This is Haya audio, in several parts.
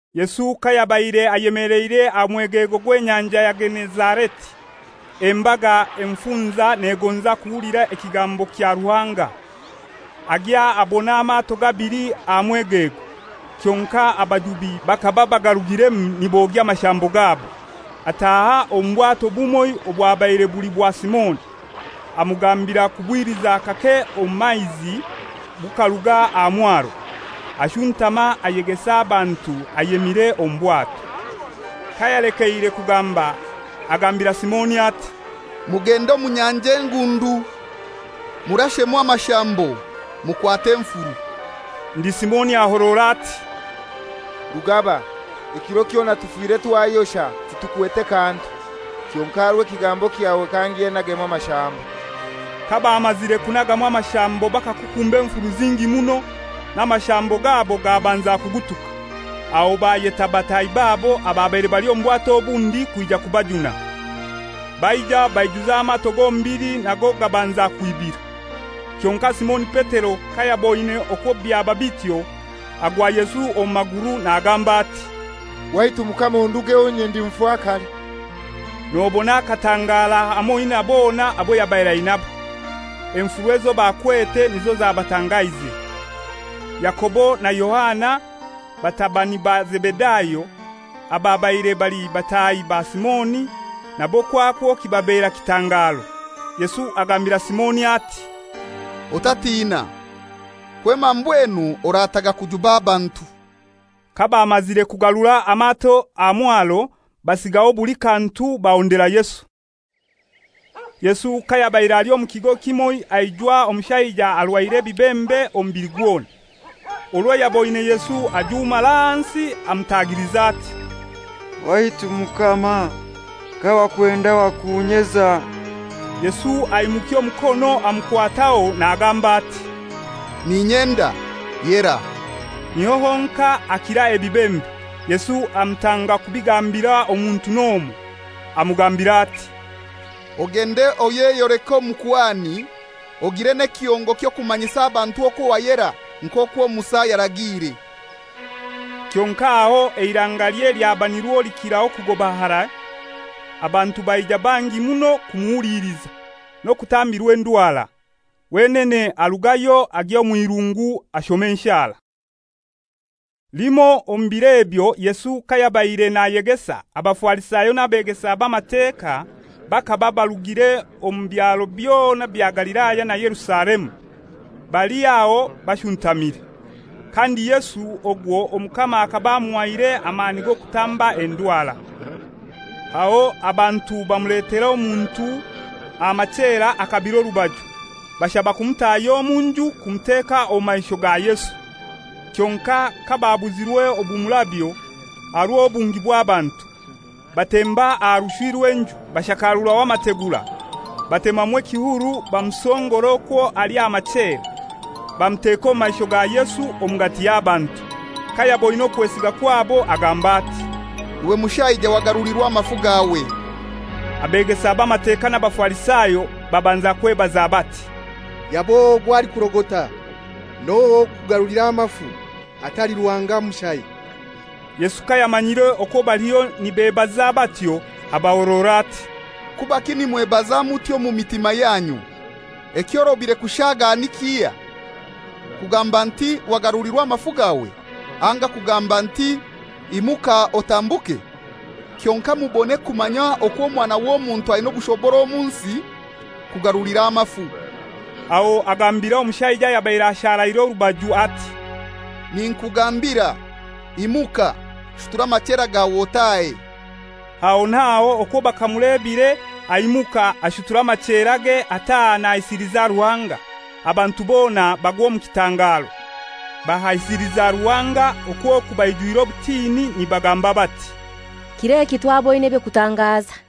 Yesu kayabaire ayemeleire aha mwegego gw'Enyanja ya Genezareti, embaga emufunza negonza kuhulira ekigambo kya Ruhanga. Agya abona amato gabili aha mwegego, kyonkai abajubi bakaba bagarugiremu nibogya amashambo gabo. Ataaha omu bwato bumoi obwabaire buli bwa Simoni, amugambira kubwiliza kake omu maizi bukaruga aha mwaro. Ashuntama ayegesa abantu ayemire omu bwato. Kayalekeire kugamba, agambira Simoni ati, «Mugende omu nyanja engundu murashemu amashambo, mukwate enfuru.» Ndi Simoni ahorora ati, «Rugaba, ekiro kyona tufire twayosha, titukwete kantu! Kyonkai aha rw'ekigambo kyawe kangye nagemu amashambo.» Kabamazire kunagamu amashambo bakukumba enfuru zingi muno, n'amashambo gabo gabanza kugutuka. Aho bayeta bataahi babo ababaire bali omu bwato obundi kwija kubajuna. Baija baijuza amato gombili nago gabanza kwibira. Kyonkai Simoni Petero kayaboine okwo byaba bityo, agwa Yesu omu maguru nagamba ati, «Waitu Mukama ondugeho; inye ndi mufakare.» Nobona akatangara hamoi na bona abo yabaire ainabo. Enfuru ezo bakwete nizo zabatangaize. Yakobo na Yohana, batabani ba Zebedayo, ababaire bali bataahi ba Simoni, nabo kwakwo kibababera kitangaro. Yesu agambira Simoni ati, «Otatiina, kwema mbwenu orataga kujuba abantu.» Kabamazire kugarura amato aha mwaro, basigaho buli kantu bahondera Yesu. Yesu kayabaire ali omu kigo kimoi aijwa omushaija arwaire ebibembe omubili gwona. Orwo yaboine Yesu ajumara ahansi amutagiliza ati, «Waitu Mukama, kawakwenda wakunyeza.» Yesu aimukya omukono amukwataho nagamba ati, «N'inyenda, yera.» Niho honkai akira ebibembe. Yesu amutanga kubigambira omuntu n'omoi. Amugambira ati, «Ogende oyeyoleke omukuhani, ogiire n'ekihongo ky'okumanyisa abantu okwo wayera, nk'okwo Musa yaragiire.» Kyonkai aho eirangalye lyaba nirwo likiraho kugoba harai. Abantu baija bangi muno kumuhuliliza, n'okutambirwa endwara. Wenene arugayo agya omw'irungu ashoma enshara. Limoi omu bir'ebyo, Yesu kayabaire nayegesa, Abafarisayo n'abeegesa b'Amateka bakaba barugire omu byaro byona bya Galilaya na Yerusalemu, bali aho bashuntamire. Kandi Yesu ogwo Omukama akaba amuhaire amani g'okutamba endwara. Aho abantu bamuletera omuntu aha machera akabire orubaju, bashaba kumutahya omu nju kumuteka omu maisho ga Yesu. Kyonkai kababuzirwe obumurabyo, aha rw'obungi bw'abantu, batemba aha rushwi rw'enju, bashakaruraho amategura, batemamu ekihuru bamusongora okwo ali aha machera, bamuteka omu maisho ga Yesu omugati y'abantu. Kayaboine okwesiga kwabo agamba ati, «Iwe mushaija wagarulirwa amafu gawe.» Abeegesa b'Amateka n'Abafarisayo babanza kwebaza bati, «Yab'ohai ogu alikurogota? N'ohai ow'okugarulira amafu, atali Ruhanga mushai?» Yesu kayamanyire okwo baliho nibebaza batyo, abahorora ati, «Kubaki nimwebaza mutyo omu mitima yanyu? Ekyorobire kushaaga ni kihai, kugamba nti ‹Wagarulirwa amafu gawe,› anga kugamba nti, ‹Imuka otambuke?› Kyonkai mubone kumanya okwo Omwana w'Omuntu aina obushobora omu nsi kugarulira amafu,» aho agambira omushaija ayabaire asharaire orubaju ati, «Ninkugambira, imuka, shutura amachera gawe otahe.» Aho naho okwo bakamulebire aimuka, ashutura amacherage ataaha nahaisiliza Ruhanga. Abantu bona bagwa omu kitangaro, bahaisiliza Ruhanga okwo oku baijwire obutini nibagamba bati, «Kir'eki twaboine eby'okutangaza.»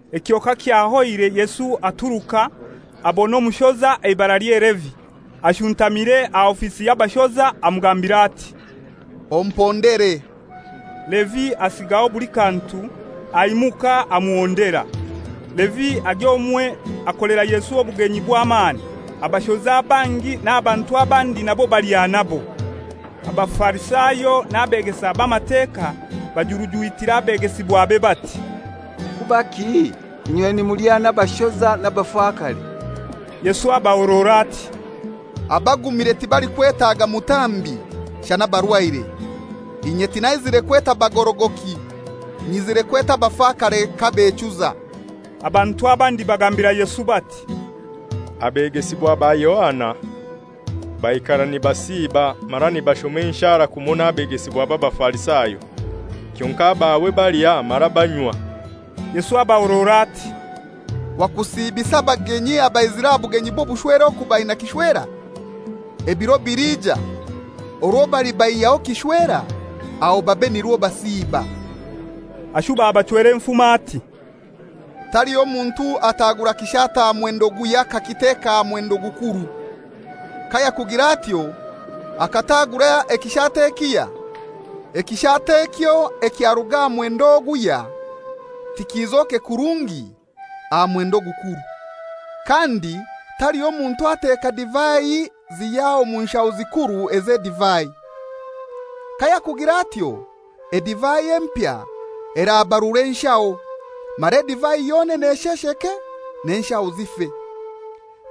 Ekyo kakyahoire Yesu aturuka, abona omushoza eibaralye Levi, ashuntamire aha ofisi y'abashoza, amugambira ati, «Ompondere.» Levi asigaho buli kantu, aimuka amuhondera. Levi agya omwe akolera Yesu obugenyi bw'amani. Abashoza bangi n'abantu abandi nabo balya nabo. Abafarisayo n'abeegesa b'Amateka bajurujwitira abegesibwabe bati, «Kubaki inywe nimulya n'abashoza n'abafakare?» Yesu abahorora ati, «Abagumire tibalikwetaga mutambi, shana abarwaire. Inye tinyizire kweta bagorogoki; nyizire kweta abafakare kabechuza.» Abantu abandi bagambira Yesu bati, «Abegesibwa ba Yohana baikara nibasiiba mara nibashoma enshara, kumoi n'abegesibwa b'Abafarisayo, kyonkai abawe balya mara banywa.» Yesu abahorora ati, «Wakusiibisa abagenyi abaizire aha bugenyi bw'obushwere oku baina kishwera? Ebiro biliija, orwo balibaihyaho kishwera, aho babe nirwo basiiba.» Ashuba abachwera enfumo ati, «Taliho muntu ataagura kishaato aha mwendo guhya akakiteka aha mwendo ogukuru. Kayakugira atyo, akataagura ekishaato ekihya, ekishaato ekyo ekyaruga aha mwendo oguhya tikizoke kurungi aha mwendo ogukuru. Kandi taliho muntu ateeka divai zihya mu nshaho zikuru ez'edivai. Kayakugira atyo, edivai empya erabarura enshaho, mara edivai yonene eshesheke, n'enshaho zife.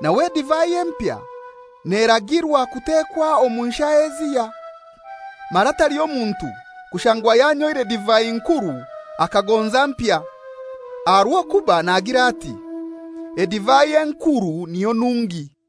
Nawe edivai empya neragirwa kutekwa omu nshaho ezihya. Mara taliho muntu kushangwa yanyoire divai nkuru akagonza mpya, aha rw'okuba nagira ati, ‹Edivai enkuru niyo nungi.›»